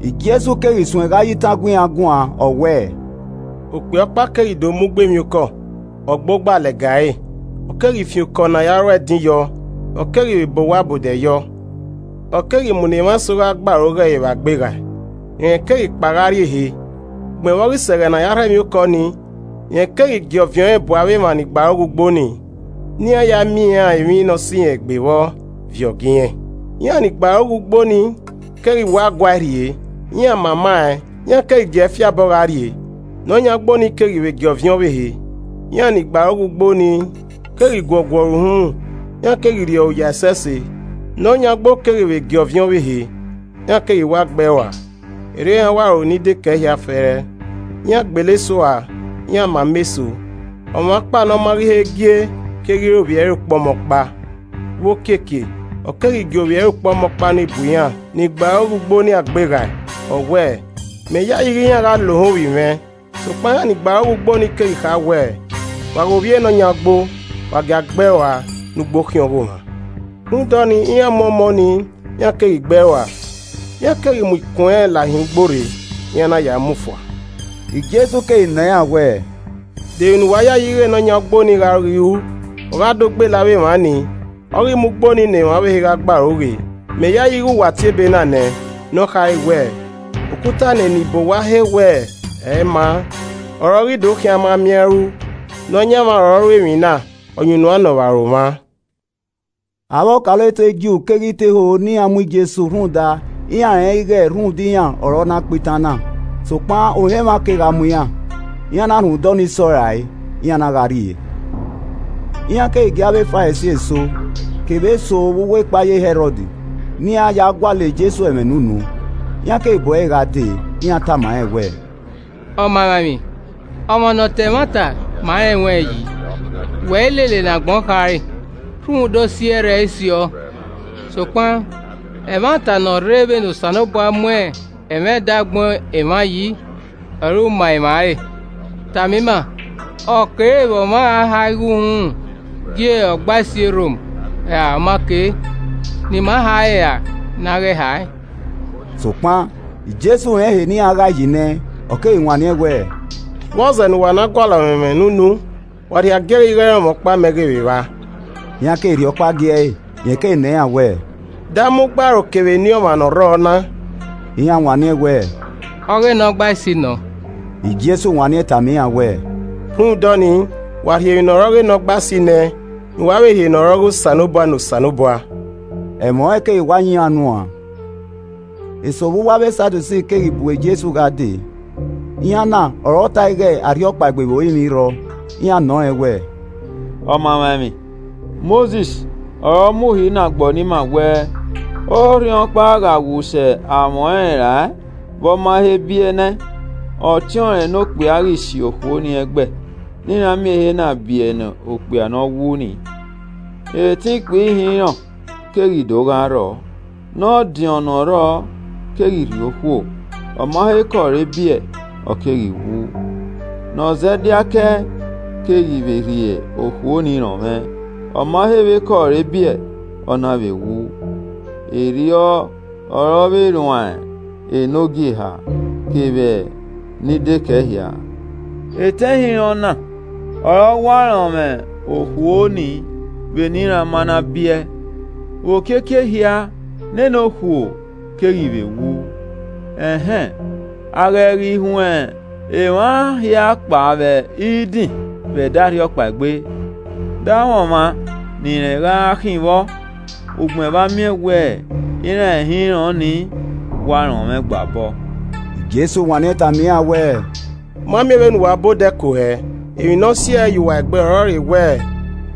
Jesu keghi suẹn gha ya itan gu iran guan, ọ wẹẹ, “Okpia ọkpa keghi do mu ugbo emwiokọ, ọ gba ogba lẹga ẹre, ọ keghi fian okọ ne a na ru ẹdin yọ, ọ keghi vbe bọ owa ọbodẹ yọ. Ọ Keghi mu ne emwa eso gha gbe aro ghe ẹre vbe agbeghae, rẹn keghi kpao gha rrie ehe. Ugbẹn vbe ọ ghi sẹ ẹghẹ ne a ya rhọ emwiokọ nii, rẹn keghi gie ọviẹn ọnrẹn bu avbe emwa ni gbe aro ghe ugbo nii, ne iran ya miẹn iran emwi ne ọ sẹ irẹn egbe vbọ viọ gie irẹn. Iran ni gbe aro ghe ugbo ni keghi wa guae rhie, iran mama ẹn, iran keghi giee fi abọ gha rrie. Ne ọ yan ugbo nii keghi vbe gie ọviẹn ọvbehe, iran ni gbe aro ghe ugbo nii, keghi guọguọ ẹre uhunmwu, iran keghi rri ọre oya ẹsẹse. Ne ọ yan ugbo keghi vbe gie ọviẹn ọvbehe, iran keghi wa gbe ẹe rua. Erriọ iran wa ru ni dekẹe hia fẹẹrẹ, iran gbele eso ua, iran mama eso. Ọmwa ọkpa ne ọ ma ghi he gie keghi re ovbi ẹre ukpọmọkpa. Vbe okiekie, ọ keghi gie ovbi ẹre ukpọmọkpa ni bu iran ni gbe aro ghe ugbo ni agbeghae, ọ wẹẹ, ‘Mẹ yayi ighẹ iran gha lohan ovbi mwẹ.’ Sokpan iran ni gbe aro ghe ugbo ni keghi kha wẹẹ, ‘Wa ghe ovbi ne ọ yan ugbo, wa gia gbe ẹe rua ne ugbo khian ọghomwa.’ Rhunmwuda ọnii, iran mu ọmọ nii, iran keghi gbe ẹe rua. Iran keghi mu ikun ẹnrẹn lahin ugbo rre, iran na ya mu fua.” Jesu keghi nọ iran wẹẹ, “De emwi ne uwa yayi ighẹ ne ọ yan ugbo ni gha ghi ru? Ọ gha do gbele avbe emwa nii, ọ ghi mu ugbo nii ne emwa ọvbehe gha gbe aro ghe. Mẹ yayi ighẹ wa tie ebe na nẹ, ne ọ khare wẹẹ: “ ‘Okuta ne eni bọ ọwa he wẹ ẹ i maa, ọre ọ ghi do khian a ma miẹn a i ru, Nọyaẹnmwa ọre ọ ru emwi na, ọyunnuan nọ vbe aro mwa.’” Avbe ọkaolotu e Ju keghi te ho ne iran mu Jesu rhunmwuda iran rẹnrẹn ighẹ rhunmwuda iran ọre ọ na kpa itan na. Sokpan ohan emwa kegha mu iran, iran na rhunmwuda ọnii sọ rae, iran na gha rrie. Iran keghi gie avbe Farisi eso, kevbe eso vbe uwu ekpayẹ Hẹrọd ne iran ya gualọ Jesu ẹmwẹ ne unu. Iran keghi bu ẹre gha dee, iran tama rẹn wẹẹ, “Ọmamwaemwi, ọmwa ne ọ ta ẹmwata ma rẹn ruẹn yi, wẹ i lele ne agbọn khare, rhunmwuda osi ẹrrẹe i siọ, sokpan, ẹmwata ne ọ rre vbene Osanobua mu ẹmwẹ edẹ agbọn emwa yi ọre u ma emwa re. Tama ima, ọ kere vbe ọmwa a ha igho uhunmwu gie Ọgbaisi e Rom ra ọ ma ke? Ne ima ha ẹre ra ne a ghẹ hae?” Sokpan Jesu rẹn ehe ne iran ghae yi nẹ, ọ keghi wanniẹn wẹẹ, “Vbọzẹ ne uwa na gualọ mwẹ ẹmwẹ ne unu? Wa rhie agiẹghẹ igho ẹrọnmwọ ọkpa mẹ ghe vbe vba.” Iran keghi rhie ọkpa gie ẹe, rẹn keghi nọ iran wẹẹ, “De ama ugbaro kevbe eni ọmwa ne ọ rrọọ na?” Iran wanniẹn wẹẹ, “Ọghe Nọgbaisi nọ.” Jesu wanniẹn tama iran wẹẹ, “Rhunmwuda ọnii, wa rhie emwi ne ọ re ọghe Nọgbaisi nẹ ẹn, ne uwa vbe rhie ne ọ re ọghe Osanobua ne Osanobua!” Ẹmwẹ ọnrẹn keghi wa yan iran unu uan. Eso vbe uwu avbe Sadusi keghi bu Jesu gha dee, iran na ọre ọ ta ẹe ighẹ arhiọkpaegbe vbe orinmwi i rrọọ. Iran nọ rẹn wẹẹ, “Ọmamwaemwi, Mosis ọre ọ mu uhi na gbọọ ne ima wẹẹ, ‘Orhiọnkpa gha wu sẹ amwẹ ọnrẹn rae vbe ọ ma he biẹ nẹ ẹn, ọtiọnrẹn ne okpia ghi si okhuo ni ẹghẹ ne iran miẹn ehe na biẹ ne okpia ne ọ wu ni!’ Etẹn ikpia ihinrọn keghi do gha rrọọ. Ne ọdiọn ne ọ rrọọ keghi rhie okhuo, ọma he kẹ ọre biẹ, ọ keghi wu. Ne ọ zẹ diake ẹe keghi rhie okhuo nii rọnmwẹ, ọma he vbe kẹ ọre biẹ, ọ na vbe wu. Erriọ ọre ọ vbe rruan e nukpogieha, kevbe ni dekẹe hia. Etẹn ihinrọn na ọre ọ wa rọnmwẹ okhuo ni vbene iran ma na biẹ. Vbe okiekie ehia, nene okhuo keghi vbe wu. Ẹn hẹn, a ghẹ ghi huẹn emwa hia kpao vbe idin vbe ẹdẹ arhiọkpaegbe, de amwẹ ọmwa ne irẹn gha khin vbọ ugbẹn vbe a miẹn wẹẹ iran ihinrọn ni wa rọnmwẹ ọẹn gba obọ?” Jesu wanniẹn tama iran wẹẹ, “U ma miẹn vbe uwa ba odẹ ku hẹẹ! Emwi ne ọ si ẹe ye uwa egbe ọrọre wẹ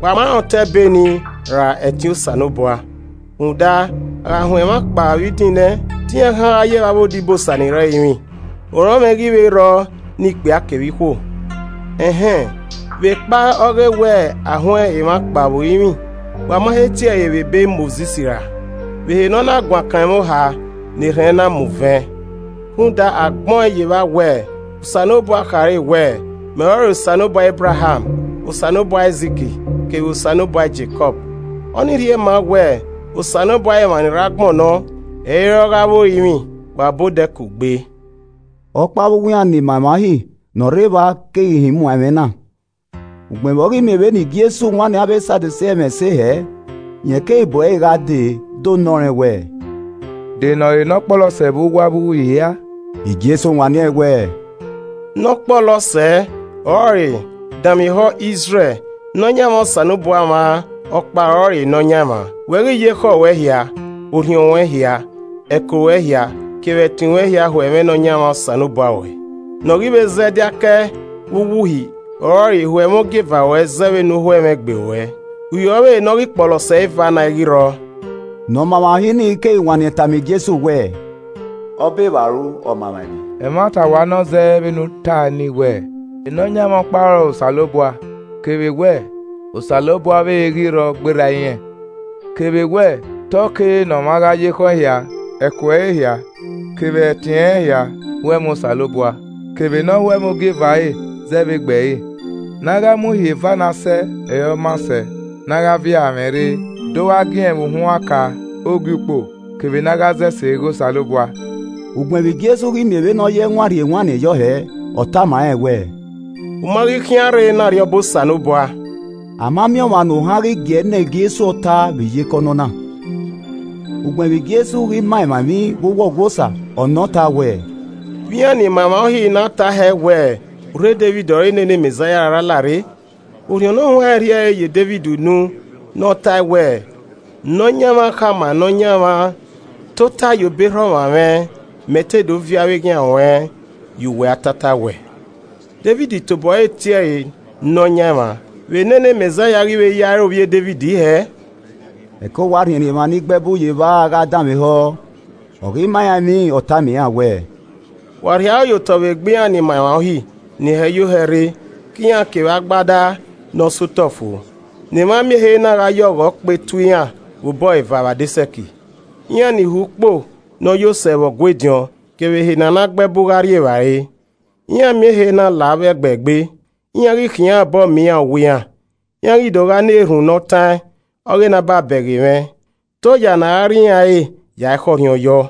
wa ma rẹn otọ Ebe nii ra ẹtin Osanobua. Rhunmwuda, a gha huẹn emwa kpao vbe idin nẹ, te iran khian gha ye vbe avbe odibosa ni rre ẹrinmwi. Orọnmwẹ i ghi vbe rrọọ ne ikpia kevbe ikhuo. Ẹn hẹn, vbe kpae ọ ghe wẹ a huẹn emwa kpao vbe orinmwi, wa ma he tie ẹre vbe ebe Mosis ra, vbe ehe ne ọ na guan kan ẹmwẹ oha ne erhẹn na mu vẹn? Rhunmwuda, a gbẹn ọẹn ye evba wẹẹ, Osanobua khare wẹẹ, ‘Mẹ ọrọre Osanobua Ebraham, Osanobua Aizik kevbe Osanobua Jekọb.’ Ọ ni rhie ma wẹ Osanobua ọghe emwa ni rre agbọn nọ, ẹ i re ọghe avbe orinmwi, wa ba odẹ ku gbe.” Ọkpa vbe uwu iran ni ma emwa Uhi ne ọ rre evba keghi họn imuan ẹmwẹ na. Ugbẹn vbe ọ ghi miẹn vbene Jesu wanniẹn avbe Sadusi ẹmwẹ ẹse hẹẹ, rẹn keghi bu ẹre gha dee do nọ rẹn wẹẹ, “De ne ọ re ne ọkpọlọ sẹ vbe uwu avbe uhi hia?” Jesu wanniẹn wẹẹ, “Ne ọ kpọlọ sẹ ọrọre ‘Danmwehọ Izrẹl Nọyaẹnmwa Osanobua mwa ọkpa ọrọre Nọyaẹnmwa. Wẹ ghi ya ekhọe ruẹ hia, orhiọn ruẹn hia, ẹko ruẹ hia, kevbe ẹtin ruẹn hia ho ẹmwẹ Nọyaẹnmwa Osanobua ruẹ.’ Ne ọ ghi vbe zẹ diake ẹe e vbe uwu uhi ọrọre ‘Ho ẹmwẹ ogieva ruẹ zẹ vbene u ho ẹmwẹ egbe ruẹ.’ Uhi ọvbehe ne ọ ghi kpọlọ sẹ eva na, ẹ i ghi rrọọ.” Ne ọma emwa Uhi nii keghi wanniẹn tama Jesu wẹẹ, “Ọbevbaru Ọmamwaemwi. Ẹmwata wa nọ zẹ vbene u tae nii wẹẹ, Nọyaẹnmwa ọkpa ọrọre Osanobua kevbe wẹ Osanobua ọvbehe i ghi vbe rrọọ gberra irẹn. Kevbe wẹ, te ọ kere ne ọmwa gha ya ekhọe ẹre hia, ẹko ẹre hia, kevbe ẹtin ẹnrẹn hia ho ẹmwẹ Osanobua kevbe nọ ho ẹmwẹ ogieva ẹre zẹ vbe egbe ẹre. Ne a gha mu Uhi eva na sẹ ọre ọ maa sẹ ne a gha viọ aranmwẹ rre do gha giẹn vbe uhunmwu aka Ogiukpo kevbe ne a gha zọ ese ghe Osanobua.” Ugbẹn vbe Jesu ghi miẹn vbene ọ ye ẹwaẹn rhie ewanniẹn yọ hẹẹ, ọ tama rẹn wẹẹ, “U ma ghi khian rrei ne Arriọba Osanobua.” Ama miẹn ọmwa ne ohan ghi gie ẹe nọ Jesu ọta vbe iyeke ọnọna. Ugbẹn vbe Jesu ghi ma emwa emwi vbe uwu Ọgua Osa, ọ nọ ọta wẹẹ, “Vbe iran ni ma emwa Uhi na tae hẹ wẹ urho Devid ọre nene Mẹzaia ra la rre? Orhiọn Ne Ọ Huanrẹn rhie ẹre ye Devid unu ne ọ tae wẹẹ, “ ‘Nọyaẹnmwa khama Nọyaẹnmwa, Tota ye obọ erha ọmwa mwẹ, mẹ te do viọ avbe eghian ruẹn, ye uwẹ atataowẹ.’ Devid tobo ẹre tie ẹre ‘Nọyaẹnmwa,’ vbe nene Mẹzaia ghi vbe ya re ovbi Devid hẹẹ?” Ẹko wa rhiẹnrhiẹn emwa ni gbe ẹbu ye evba gha danmwehọ ọ ghi ma iran emwi, ọ tama iran wẹẹ, “Wa rhie aro ye otọ vbe egbe iran ni ma emwa Uhi, ni hẹ yo hẹ rre ke iran kevbe agbada ne ọ sẹ otọ fo, ne emwa miẹn ehe na gha ye ọghọ kpe tuẹ iran vbe obọ eva vbe adesẹ ẹki. Iran ni ho ukpo ne ọ yo sẹ vbe Ọgua ediọn kevbe ehe ne a na gbe ẹbu gha rri evbare. Iran miẹn ehe na la avbe ẹgbẹ egbe, iran ghi khiẹn iran obọ miẹn iran owa iran, iran ghi do gha na erhunmwu ne ọ taẹn ọghe ne a ba bẹghe mwẹ. Te oya ne a ra rri iran ẹre yae khọrhiọn yọ!”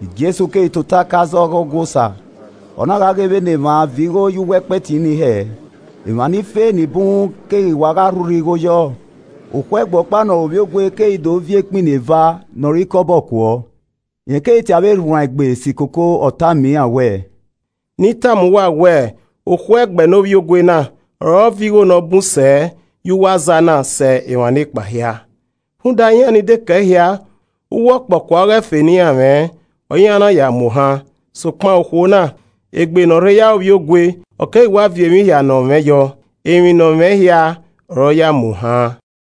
Jesu keghi tota ke aza ọghe Ọgua Osa. Ọ na gha ghe vbene emwa viọ igho ye uwu ẹkpẹti ni hẹẹ. Emwa ni fe ni bun keghi wa gha rhurhẹ igho yọọ. Okhuo ẹgbẹ ọkpa ne ọ re ovbiogue keghi do viọ ekpini eva ne ọ re ikọbọ kuọ. Rẹn keghi tie avbe erhuanegbe si koko ọ tama iran wẹẹ, “Ne I tama uwa wẹ okhuo ẹgbẹ ne ovbiogue na ọre ọ viọ igho ne ọ bun sẹ ye uwu aza na sẹ emwa nekpa hia. Rhunmwuda, iran ni dekẹe hia uwu ọkpọkua ọghe ẹfe ne iran mwẹ, ọre iran na ya yo imuohan, sokpan, okhuo na, egbe ne ọ rhe ya re ovbiogue, ọ keghi wa viọ emwi hia ne ọ mwẹ yọ, emwi ne ọ mwẹ hia ọre ọ ya yo imuohan.”